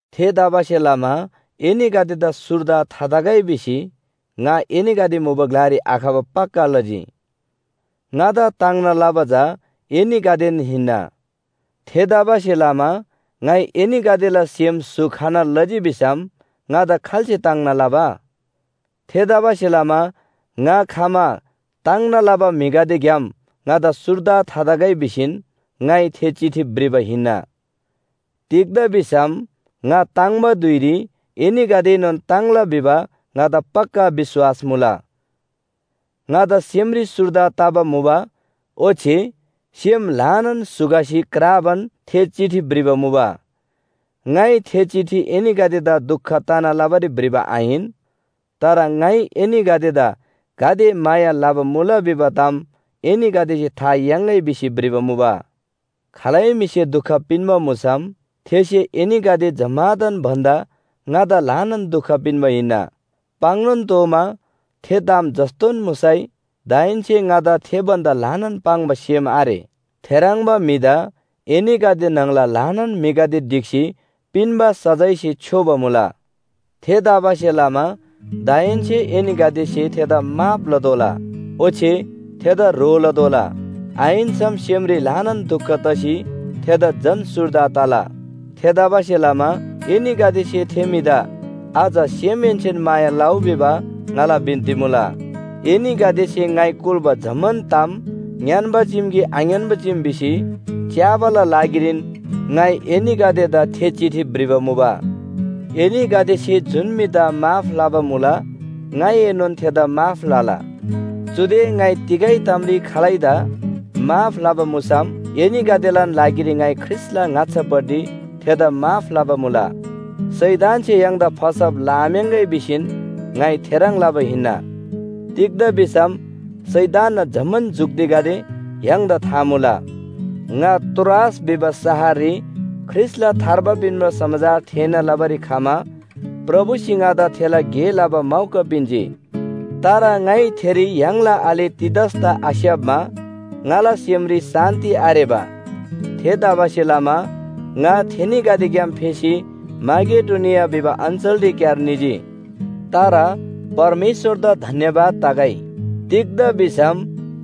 थेतबासेलमा एनीगदेदा सुर्दा थातगै भिसी ङा एनीगदे मुबा ग्‍लारी आखबा पक्‍का लजी। ङादा ताङ्ना लबा चा एनीगदेन हिन्‍ना। थेतबासेलमा ङाइ एनीगदेला सेम स्‍हु खना लजी भिसम ङादा खाल्‍से ताङ्ना लबा? थेतबासेलमा ङा खमा ताङ्ना लबा म्‍हिगदेग्‍याम ङादा सुर्दा थातगै भिसीन ङाइ थे चिठी भ्रिबा हिन्‍ना। तिग्‍दा भिसम ङा ताङ्‍बा धुइरी एनीगदेएनोन ताङ्ला भिबा ङादा पक्‍का विश्‍वास मुला। ङादा सेमरी सुर्दा तबा मुबा ओच्‍छे सेम ल्‍हानान स्‍हु खसी क्राबान थे चिठी भ्रिबा मुबा। ङाइ थे चिठी एनीगदेदा दुख तना लबारी भ्रिबा आहिन, तर ङाइ एनीगदेदा गाते माया लबा मुला भिबा ताम एनीगदेसे था याङ्‌गै भिसी भ्रिबा मुबा। खालै म्‍हिसे दुख पिन्‍बा मुसम थेसे एनीगदे जम्‍मादान भन्‍दा ङादा ल्‍हाना दुख पिन्‍बा हिन्‍ना। पाङ्‌नोन तोःमा थे ताम जस्‍तोन मुसैनोन दाहेन्‍से ङादा थे भन्‍दा ल्‍हाना पाङ्बा सेम आरे। थेह्रङ्बा म्‍हिदा एनीगदे न्‍हङला ल्‍हानान म्‍हिगदे ढिक्‍सी पिन्‍बा सजायसे छ्‌योबा मुला। थेतबासेलमा दाहेन्‍से एनीगदेसे थेदा माफ लतोःला, ओच्‍छे थेदा ह्रो लतोःला। आहिन्‍सम सेमरी ल्‍हानान दुख तसी थेदा झन सुर्दा तला। थेतबासेलमा एनीगदेसे थे म्‍हिदा अझ सेमहेन्‍सेन माया लउ भिबा ङाला बिन्‍ती मुला। एनीगदेसे ङाइ कुल्‍बा जम्‍मान ताम ङ्‌यान्‍बा चीम कि आङ्‌यान्‍बा चीम भिसी च्‍याबाला लागिरीन ङाइ एनीगदेदा थे चिठी भ्रिबा मुबा। एनीगदेसे जुन म्‍हिदा माफ लबा मुला ङाइएनोन थेदा माफ लला। चुदे ङाइ तिगै तामरी खालैदा माफ लबा मुसम एनीगदेलान लागिरी ङाइ ख्रीष्‍टला ङाच्‍छापट्टि थेदा माफ लबा मुला। शैतानसे य्‍हाङदा फसब लआम्‍याङ्‍गै भिसीन ङाइ थेह्रङ् लबा हिन्‍ना। तिग्‍दा भिसम शैतानना जम्‍मान जुक्तिगदे य्‍हाङदा था मुला। ङा त्रोआस भिबा शहररी ख्रीष्‍टला थार्बा पिन्‍बा समाचार थेःना लबारी खमा प्रभुसे ङादा थेला गे लबा मौका पिन्‍जी। तर ङाइ थेरी य्‍हाङला आले तीतसदा आस्‍याप्‍मा ङाला सेमरी शान्‍ति आरेबा। थेतबासेलमा ङा थेनीगदेग्‍याम फेसी माकेडोनिया भिबा अञ्‍चलरीक्‍यार निजी। तर परमेश्‍वरदा धन्‍यवाद तगै, तिग्‍दा भिसम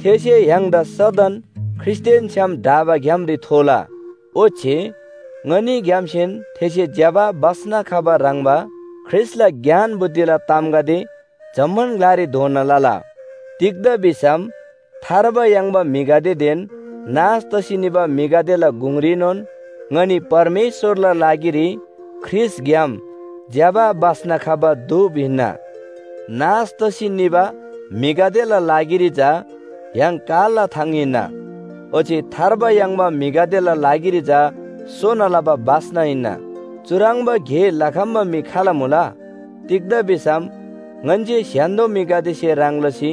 थेसे य्‍हाङदा सदन ख्रीष्‍टदेन छ्‌याम ढाबा ग्‍यामरी थोला। ओच्‍छे ङनीग्‍यामसेन थेसे ज्‍यबा बास्‍ना खबा ह्रङ्‌बा ख्रीष्‍टला ज्ञान बुद्धिला तामगदे जम्‍मान ग्‍लारी धोना लला। तिग्‍दा भिसम थार्बा याङ्बा म्‍हिगदेदेन नाश तसी निबा म्‍हिगदेला गुङरीनोन ङनी परमेश्‍वरला लागिरी ख्रीष्‍टग्‍याम ज्‍यबा बास्‍ना खबा धूप हिन्‍ना। नाश तसी निबा म्‍हिगदेला लागिरी चा य्‍हाङ कालला थाङ हिन्‍ना, ओच्‍छे थार्बा याङ्बा म्‍हिगदेला लागिरी चा सोना लबा बास्‍ना हिन्‍ना। चुह्रङ्बा गे लखम्‍बा म्‍हि खाल मुला? तिग्‍दा भिसम ङन्‍से स्‍य्‍हान्‍दो म्‍हिगदेसे ह्रङ् लसी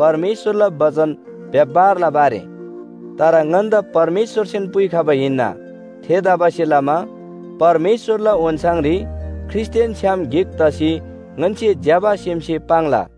परमेश्‍वरला बचन व्‍यापार लबा आरे। तर ङन्‍दा परमेश्‍वरसेन पुइखबा हिन्‍ना। थेतबासेलमा परमेश्‍वरला ओन्‍छाङरी ख्रीष्‍टदेन छ्‌याम गिक तसी ङन्‍से ज्‍यबा सेमसे पाङ्ला।